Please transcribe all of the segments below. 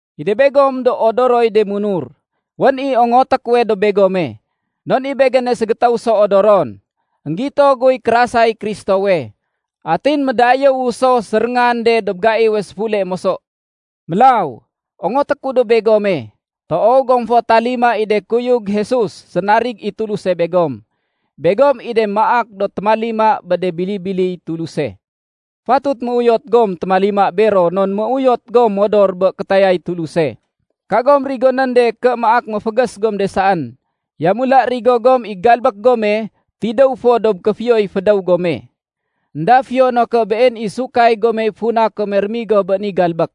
I de begom do odoroy de munur, wén i ongoté kuwe dob begome, non i begéne ségétéw so odoron. Enggito guy kérasay Kristowe, atin médayéwu so séréngan de dob gaiwe séfule moso. Mélaw, ongoté ku dob begome, toow gom fo talima i de kuyug Jesus sénarig i Tuluse begom. Begom i de maak do témalima bé de bili-biliy Tuluse. Fatut méuyot gom témalima bero non méuyot gom modor bé kétayay Tuluse. Kagom rigonén de ké maak méfégés gom de saén. Yamula rigo gom i galbék gome tidéw fo dob kéfiyoy fédéw gome. Enda fiyo no ké been i sahud gomey funa kome rémigo bé ni galbék.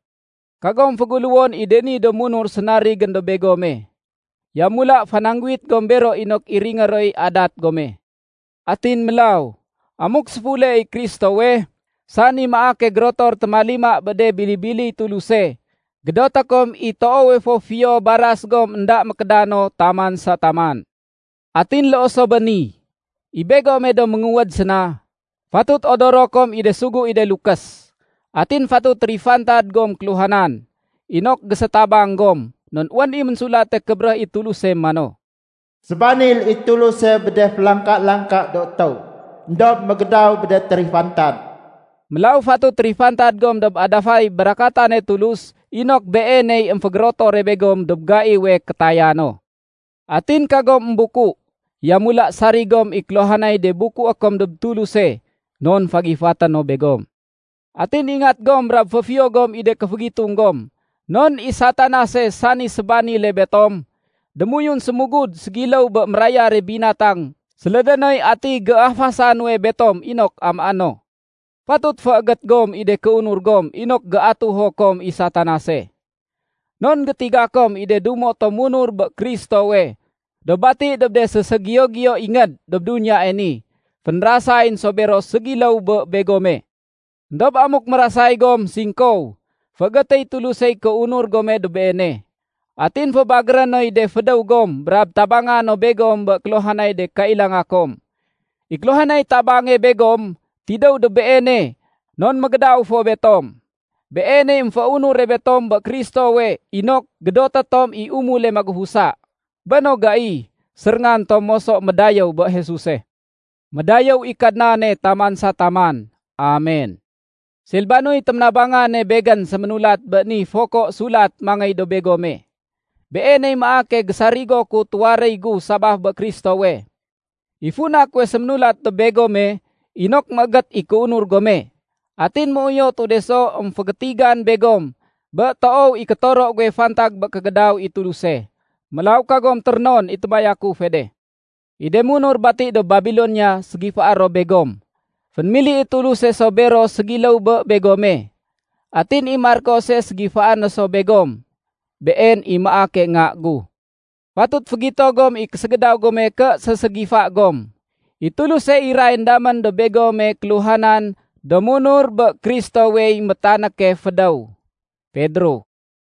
Kagom féguléwon i de ni do munur sénarigén dob begome. Yamula fanangguwit gom bero inok iringé roy adat gome. Atin mélaw, amuk séfule i Kristowe, sani maake gérotor témalima bé de bili-biliy Tuluse, gédoté kom i toowe fo fiyo baras gom énda mékédano taman sa taman. Atin loo so bé ni, i begome do ménguwéd séna, fatut odoro kom i de sugu i de lukés. Atin fatut térifantad gom kéluhanan, inok gésétabang gom. Non wén i Ménsulate Kébéréh i Tuluse mano, “Sébanil i Tuluse bé de félangka-langka do étéw, éndob mégédaw bé de térifantad.” Mélaw fatut térifantad gom dob adafay barakatane Tulus inok Beeney émfégérotore begom dob gaiwe kétaya no. Atin kagom émbuku, yamula sarig gom i kéluhanay de bukué kom dob Tuluse, non fagifaté no begom. Atin ingat gom brab féfiyo gom i de kéfégitung gom. Non i Satanase, sani sébanile betom, démoyun sémugud ségiléw bé mérayare binatang sélédé noy ati géafasa nuwe betom inok amaé no. Fatut féégét gom i de kéunur gom inok géatuho kom i Satanase. Non gétiga kom i de dumo tom munur bé Kristowe do bati dob de séségiyo-giyo ingéd dob duniyae ni, fénrasayén so bero ségiléw bé begome. Endob amuk mérasay gom singkow, féégétéy Tulusey kéunur gome dob Beene. Atin fébagéré noy de fédéw gom brab tabanga no begom bé kéluhanay de kailanga kom. I kéluhanay tabange begom, tidéw dob Beene non mégédaw fo betom. Beeney émféunure betom bé Kristowe inok gédoté tom i umule magufusa. Bé no gai, séréngan tom moso médayéw bé Jesuse. Médayéw i Kadnane taman sa taman. Amen! Silbanoy téménabangane begén séménulat bé ni foko sulat mangéy dob begome. Beeney maake gésarigo ku tuwaréy gu sabaf bé Kristowe. I funa kuwe séménulat dob begome inok méégét i kéunur gome. Atin méuyotu de so émfégétigan begom bé toow i kétoro guwe fantag bé kégédaw i Tuluse. Mélaw kagom térénon i témayakufe de. I de munur bati dob Babilonia ségifaé ro begom. Fénémili i Tuluse so bero ségiléw bé begome. Atin i Markose ségifaé no so begom. Been i maake nga gu. Fatut fégito gom i késégédaw gome ké séségifa gom. I Tuluse irayén damén dob begome kéluhanan do munur bé Kristowey métanéke fédéw. Pedro